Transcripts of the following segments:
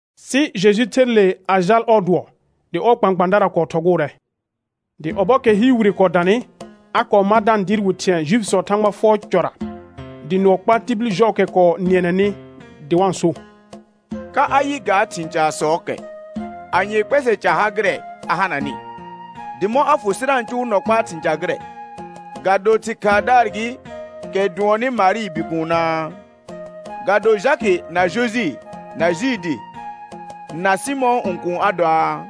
Sɩ Jeju kɔɔ ther le a jal ɔɔ dʋɔ, dɩ ɔɔ kpãkpãadara kɔɔ thɔgʋʋrɛ. Dɩ ɔbɔɔkɛ hɩɩr wire kɔɔ danɩ, a kɔɔ mar da-n dɩɩr wɩ thɩ̃ɛ Juifisɔɔ Thãgba fʋɔr cɔra; dɩ nʋɔ kpaa tibil jɔɔkɛ kɔɔ nɩɛnɛnɩ dɩ wa-n so: Ka a yɩ ga thɩ̃ casɔɔkɛ? Anyee kpɛsɛ ca ha gɩrɛ a hananɩ? Dɩ mɔ̃ a fʋ sɩ da-n cʋʋ nɔ kpaa thɩ̃ ca gɩrɛ? Ga do thɩ̃ khaadaar gɩ, kɛ dʋɔnnɩ Marɩɩ bikuunaa? Ga do Jakɩ, na Jojɩ, na Juudi, na Sɩmɔ̃ɔ õkuun a doaa?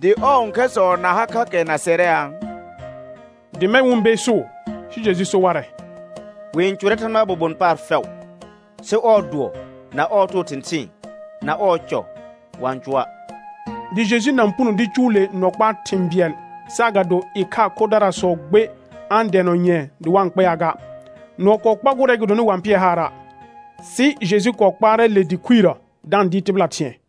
Dɩ ɔɔ õkhɛrsɔ na ha kha kɛ na sɛrɛaa? Dɩ mɛ̃ wɩ-n beesuu. Sɩ Jeju so warɛ: Wɩ-n cʋrɛ Thãgbaa bobon paar fɛʋ, sɩ ɔɔ dʋɔ na ɔɔ too thɩ̃thɩɩn na ɔɔ cɔ, wa-n cʋa'. Dɩ Jeju na-n puno dɩ cʋʋ le nɔ kpaa thɩ̃ bɩɛl, saagado ɩkhaa khodaarsɔ gbe a-n dɛɛnɔ nyɛ̃ɛ dɩ wɩ kpɛaa ga. Nʋɔ kɔɔ kpagʋʋrɛ gɩdonɩ wa-n pɩɛ haara'. Sɩ Jeju kɔɔ kpaarɛ le dɩ khuirəsɔ da-n dɩɩr tɩbɩla thɩ̃ɛ.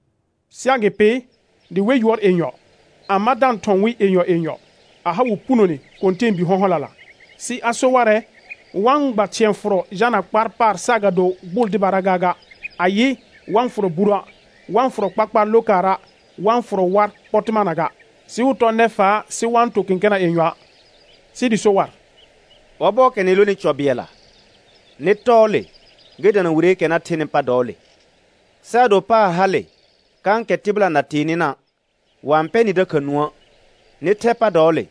Sɩ agɩpɩ, dɩ we yʋɔr yenyɔ, a ma da-n thɔ̃ wɩ yenyɔ yenyɔ, a ha wɩ punone kɔ̃tɛɛbi hɔ̃hɔlala. Sɩ a so warɛ, wa-n gba thɩ̃ɛ fʋrɔ jalna kpaar paar saagado gbʋʋl dɩbara gaaga; ayɩ, wa-n fʋrɔ buruə', wa-n fʋrɔ kpakpaar lokaara', wa-n fʋrɔ war pɔtɩmana ga, sɩ wɩ tɔ nɛfaa sɩ wa-n to kẽkena yenyɔa'. Sɩ dɩ so war: Ɔbɔɔkɛ nɩ lonɩ cɔ bɩɛlla, nɩ tɔɔ le gɩ dana wireekɛ na thenɩ pa dɔɔle. Sɩ ado paar hale kãkɛ tɩbɩla na tee nɩna', wa-n pɛ nɩ dakha nũə', nɩ thɛ pa dɔɔle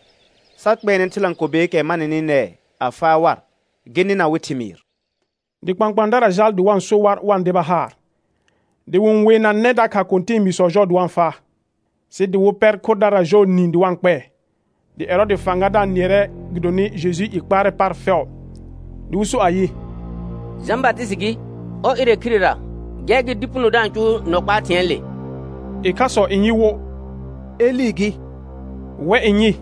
sa kpɛɛnɛ thɩlãkobeekɛ ma nɩnɩ nɛɛ a faa war, gɩ nɩna wɩ thɩmɩɩr. Dɩ kpãkpãadara jaal dɩ wa-n so war wa-n deba haar, dɩ wɩ-n weenanɛ dakha kɔ̃tɛɛbiisɔ jɔɔ dɩ wa-n faa, sɩ dɩ wɩ pɛr khodara jɔɔ niin dɩ wa-n kpɛɛ. Dɩ Ɛrɔɔdɩ fãgadaar nɩɛrɛ gɩdonɩ Jejuu i kpaarɛ paar fɛʋ, dɩ wɩ so ayɩ: Jã Batɩsɩtɩ gɩ, ɔr ɩrɛ khirera, gɛr gɩ dɩ puno da-n cʋʋ nɔ kpaa thɩ̃ɛɛle. Ɩkhasɔ n yɩ wo: Elɩ gɩ; wɛ n yɩ: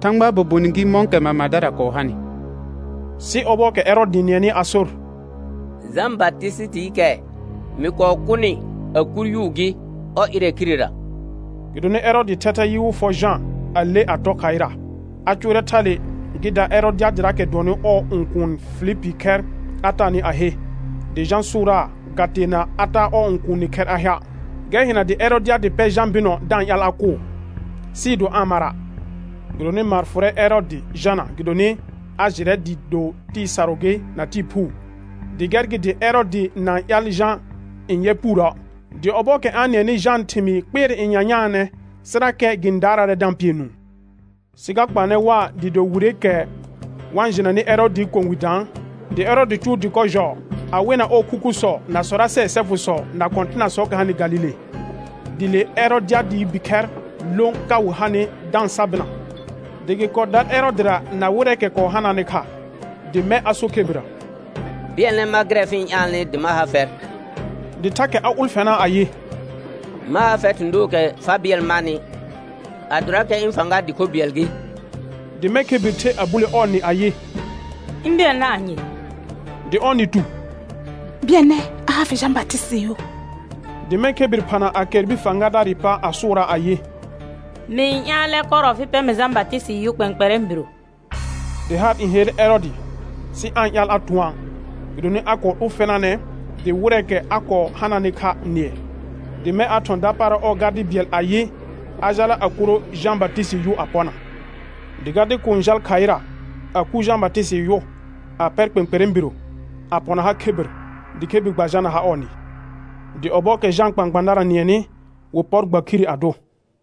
Thãgbaa bobon gɩ mɔ̃kɛ mamadara kɔɔ hanɩ. Sɩ ɔbɔɔkɛ Ɛrɔɔdɩ nɩɛnɩ a sor: Jã Batɩsɩtɩɩkɛ mɩ kɔɔ kʋnɩ a kur yʋʋ gɩ, ɔr ɩrɛ khirera. Gɩdonɩ Ɛrɔɔdɩɩ thɛthɛ yɩ wɩ fɔ Jã a le tɔ khaɩra. A cʋʋrɛ thale gɩ da Ɛrɔdɩadɩraakɛ dʋɔnnɩ ɔɔ õkuun Filipii khɛr a taanɩ a he; dɩ Jã sʋʋraa ga teena a taa ɔɔ õkuuni khɛr a hea'. Gɛr hɩna dɩ Ɛrɔdɩadɩ pɛ Jã bɩnɔ da-n ƴaal a kʋʋ, sɩɩ do aa-n mara'. Gɩdonɩ maar n fʋrɛ Ɛrɔɔdɩ Jana, gɩdonɩ a jɩrɛ dɩɩ do tɩɩ sarʋ gɩ na tɩɩ phuu, dɩ gɛr gɩ dɩ Ɛrɔɔdɩ na-n ƴaal Jã n yɛ puurə'; dɩ ɔbɔɔkɛ a-n nɩɛnɩ Jãa thɩmɩɩ kpɩɛrɛ nyanyaanɛ, sɩrakɛ gɩ-n daaraarɛ da-n pɩɛ nũu. Sɩ ga kpaanɛ waa dɩɩ do wireekɛ wa jɩnanɩ Ɛrɔɔdɩɩ kɔ̃ wi daan; dɩ Ɛrɔɔdɩ cʋʋ dɩkɔ jɔɔ, a wena ɔɔ khukhusɔ na sɔrasɛɛ sɛfʋsɔ na kɔ̃tɩnasɔɔkɛ hanɩ Galile. Dɩ le Ɛrɔdɩadɩɩ bikhɛr lõ ka wɩ hanɩ da-n sa bɩna, dɩ gɩ kɔɔ dar Ɛrɔɔdɩra na wɩrɛɛkɛ kɔɔ hanaanɩ kha; dɩ mɛ̃ a so khebirrə: Bɩɛlnɛ mar gɩrɛ fɩ-n ƴaalnɩ dɩ ma ha fɛr; dɩ thakɛ a ʋlfɛnaa ayɩ: Ma ha fɛr thɩ̃ dookɛ fa bɩɛl marnɩ, adorakɛ ɩ̃ fãga dɩ kho bɩɛl gɩ. Dɩ mɛ̃ khebir the a bule ɔɔ nɩ ayɩ: Ɩ̃ bɩɛlnɛ anye? Dɩ ɔɔ nɩ tu: Bɩɛlnɛ a ha fɩ Jã Batɩsɩtɩɩ yʋ. Dɩ mɛ̃ khebir phana a kɛr bir fãgadaarɩ pa a sʋʋraa ayɩ: Mɩ-n ƴaalɛ kɔrɔ fɩ pɛ mɩ Jã Batɩsɩtɩɩ yʋ kpɛ̃kpɛrɛ̃ biro. Dɩ haar n helle Ɛrɔɔdɩ, sɩ aa-n ƴaal a tʋ̃ɔa', gɩdonɩ a kɔɔ ʋlfɛnaanɛ dɩ wɩrɛɛkɛ a kɔɔ hananɩ kha nɩɛ. Dɩ mɛ̃ a thɔ̃ dapaara ɔɔ gardɩ bɩɛl ayɩ, a jala a kuro Jã Batɩsɩtɩɩ yʋ a pɔna. Dɩ gardɩ kuun jal khaɩra, a kur Jã Batɩsɩtɩɩ yʋ, a pɛr kpɛ̃kpɛrɛ̃ biro, a pɔna ha khebir, dɩ khebir gba jalna ha ɔɔ nɩ. Dɩ ɔbɔɔkɛ Jãa kpãkpãadara nɩɛnɩ, wɩ pɔr gba khire a dʋ.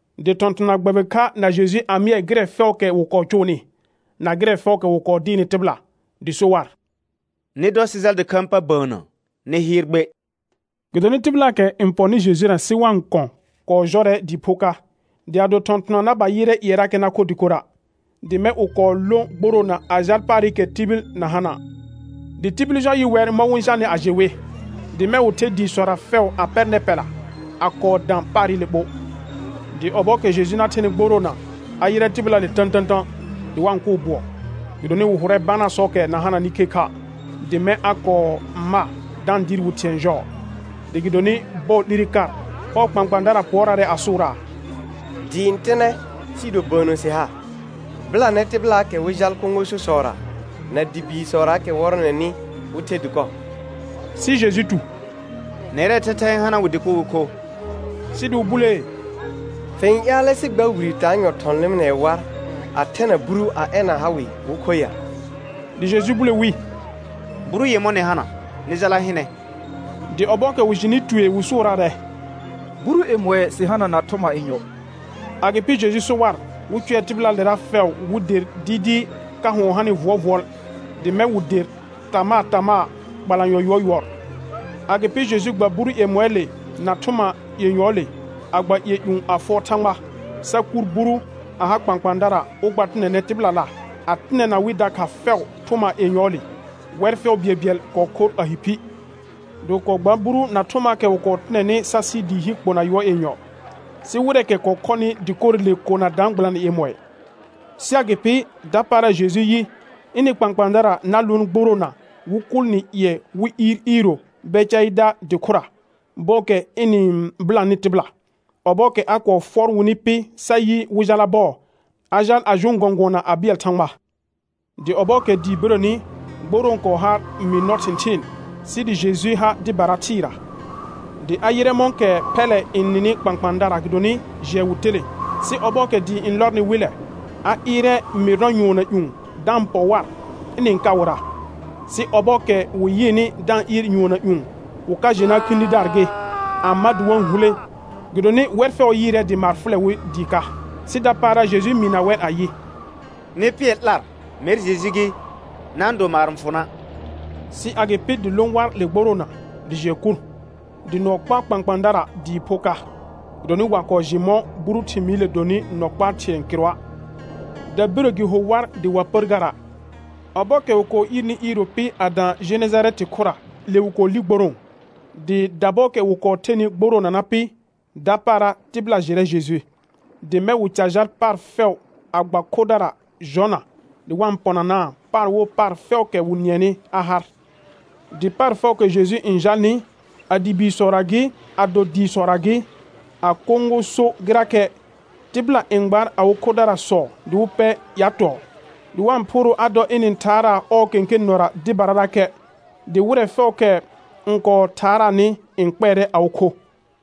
Dɩ thɔ̃thɔna gbɛbɩ kha na Jeju a mɩɛɛ gɩrɛ fɛʋʋkɛ wɩ kɔɔ cʋʋnɩ, na gɩrɛ fɛʋʋkɛ wɩ kɔɔ dɩɩrnɩ tɩbɩla. Dɩ so war: Nɩ dɔ sɩ jal dɩkhãa pa bəənnə nɩ hɩɩr gbe, gɩdonɩ tɩbɩlaakɛ n pɔnɩ Jejura sɩ wa-n kɔ̃ kɔɔ jɔrɛ dɩɩ pho ka, dɩ a do thɔ̃thɔna na ba yɩrɛ ƴɩɛrakɛ na kho dɩkora'. Dɩ mɛ̃ wɩ kɔɔ lõ gborõo a jal paarɩkɛ tibil na hana'. Dɩ tibil jɔ yɩ wɛr mɔ̃ wɩ-n jalnɩ a jɩ wɩ, dɩ mɛ̃ wɩ the dɩɩsɔra fɛʋ a pɛr nɛpɛla a ka kɔɔ dã paarɩle ɓo. Dɩ ɔbɔɔkɛ Jeju na thenɩ gboroona, a yɩrɛ tɩbɩlaale tə̃tə̃tə̃ dɩ wa-n kʋʋ bʋɔ, gɩdonɩ wɩ hʋrɛ banasɔɔkɛ na hananɩ khekha', dɩ mɛ̃ a kɔɔ ma da-n dɩɩr wɩ thɩ̃ɛ jɔɔ. Dɩ gɩdonɩ bɔɔ 'lire kar, ɔɔ kpãkpãadara pʋɔraarɛ a sʋʋraa: Dɩɩ n tɩnɛ sɩɩ do bəənnə sɩ ha; bɩlanɛ tɩbɩlaakɛ wɩ jal kõgososɔra na dɩ biisɔraakɛ wɔrɔnɛnɩ, wɩ the dɩkɔ. Sɩ Jeju tu: Nɛrɛɛ thɛthɛ n hana wɩ dɩkɔ wɩ kho. Sɩ dɩ wɩ bulee: Fɩ-n ƴaalɛ sɩ gba wire taanyɔ thɔ̃ lɩmɩnɛɛ war a thɛna buru a ɛna ha wɩ wɩ kho ya? Dɩ Jeju bule wi: Buru yemɔ̃ nɩ hana, nɩ jala hɩnɛ. Dɩ ɔbɔɔkɛ wɩ jɩnɩ tue wɩ sʋʋraarɛ: Buru yemɔɩ sɩ hana na thʋma yenyɔ. Agɩpɩ Jeju so war, wɩ cʋɛ tɩbɩlaalera fɛʋ wɩ der dɩɩdɩɩ ka hʋɔn hanɩ vʋɔlvʋɔl. Dɩ mɛ̃ wɩ der tamaa tamaa, kpalanyɔ yʋɔr yʋɔr. Agɩpɩ Jeju gba buru yemɔɩɩle na thʋma yenyɔɔle, a gba ƴɩɛ ƴũ a fʋɔr Thãgba, sa kuur buru a ha kpãkpãadara wɩ gba tɩnɛnɛ tɩbɩlala, a tɩnɛna wɩ dakha fɛʋ thʋma yenyɔɔle. Wɛr fɛʋ bɩɛlbɩɛl kɔɔ khor a hi phi. Dɩ wɩ kɔɔ gbaar buru na thʋmaakɛ wɩ tɩnɛnɩ sa sɩ dɩɩ hi kpona yʋɔr yenyɔ. Sɩ wɩrɛɛkɛ kɔɔ khɔnɩ dɩkorɩle kona daan gbɩlanɩ yemɔɩ. Sɩ agɩpɩ, dapaara Jeju yɩ, ɩnɩ kpãkpãadara na lʋʋn gboroona wɩ kʋʋl nɩ ƴɩɛ wɩ iir iiro Bɛcaɩda dɩ khʋra, bɔɔkɛ ɩna-n bɩlanɩ tɩbɩla. Ɔbɔɔkɛ a kɔɔ fʋɔr wɩnɩ pɩ sa yɩ wɩ jala bɔɔ, a jaal a jʋʋn gɔ̃gʋɔna a bɩɛl Thãgba. Dɩ ɔbɔɔkɛ dɩɩ birəni, gborõo kɔɔ har mɩɩr nɔ thɩ̃thɩɩn, sɩ dɩ Jeju ha dɩbara thɩɩra. Dɩ a yɩrɛ mɔ̃kɛ phɛllɛ n nɩnɩ kpãkpãadara gɩdonɩ jɩɛ wɩ telẽ, sɩ ɔbɔɔkɛ dɩɩ n lɔrnɩ wɩllɛ, a ɩɩrɛ mɩɩr nɔ nyʋɔnna ƴũ da-n pɔ war ɩnɩ-n ka wɩra. Sɩ ɔbɔɔkɛ wɩ yɩɩnɩ da-n ɩɩr nyʋɔnna ƴũ, wɩ ka jɩna khĩdidaar gɩ, a ma dɩ wa-n hulẽ; gɩdonɩ wɛr fɛʋ yɩɩrɛ dɩ maar fʋlɛ wɩ dɩɩ ka. Sɩ dapaara Jeju mɩɩna wɛr ayɩ: Nɩ pɩɛr 'lar, mɛr Jeju gɩ, na-n do maar n fʋ na'. Sɩ agɩpɩ dɩ lõ war le gboroona, dɩ jɩɛ kur, dɩ nʋɔ kɔɔ kpaa kpãkpãadara dɩɩ pho ka, gɩdonɩ wa kɔɔ jɩ mɔ̃ buru thɩmɩɩrɩle donɩ nɔ kpaa thɩ̃ɛ kɩrʋa', dəbire gɩ ho war dɩ wa pər gara'. Ɔbɔɔkɛ wɩ kɔɔ iirni iiro pɩ a dã Jenejarɛtɩ khʋra, le wɩ kɔɔ li gborõo. Dɩ dabɔɔkɛ wɩ kɔɔ thenɩ gboroona na pɩ, dapaara tɩbɩla jɩrɛ Jeju. Dɩ mɛ̃ wɩ ca jal paar fɛʋ a gba khodara jɔna, dɩ wa-n pɔnanaa paar wo paar fɛʋʋkɛ wɩ nɩɛnɩ a har. Dɩ paar fɛʋʋkɛ Jeju n jalnɩ, a dɩ biisɔra gɩ, ado dɩɩsɔra gɩ, a kõgoso gɩrakɛ, tɩbɩla n gbaar awɩ khodaarsɔ dɩ wɩ pɛ ƴatɔɔ, dɩ wa-n phʋʋrʋʋ a dɔ ɩna-n thaaraa ɔɔ kẽkẽ nɔra dɩbararakɛ, dɩ wɩrɛ fɛʋʋkɛ n kɔɔ thaaraanɩ n kpɛɛrɛ awɩ kho.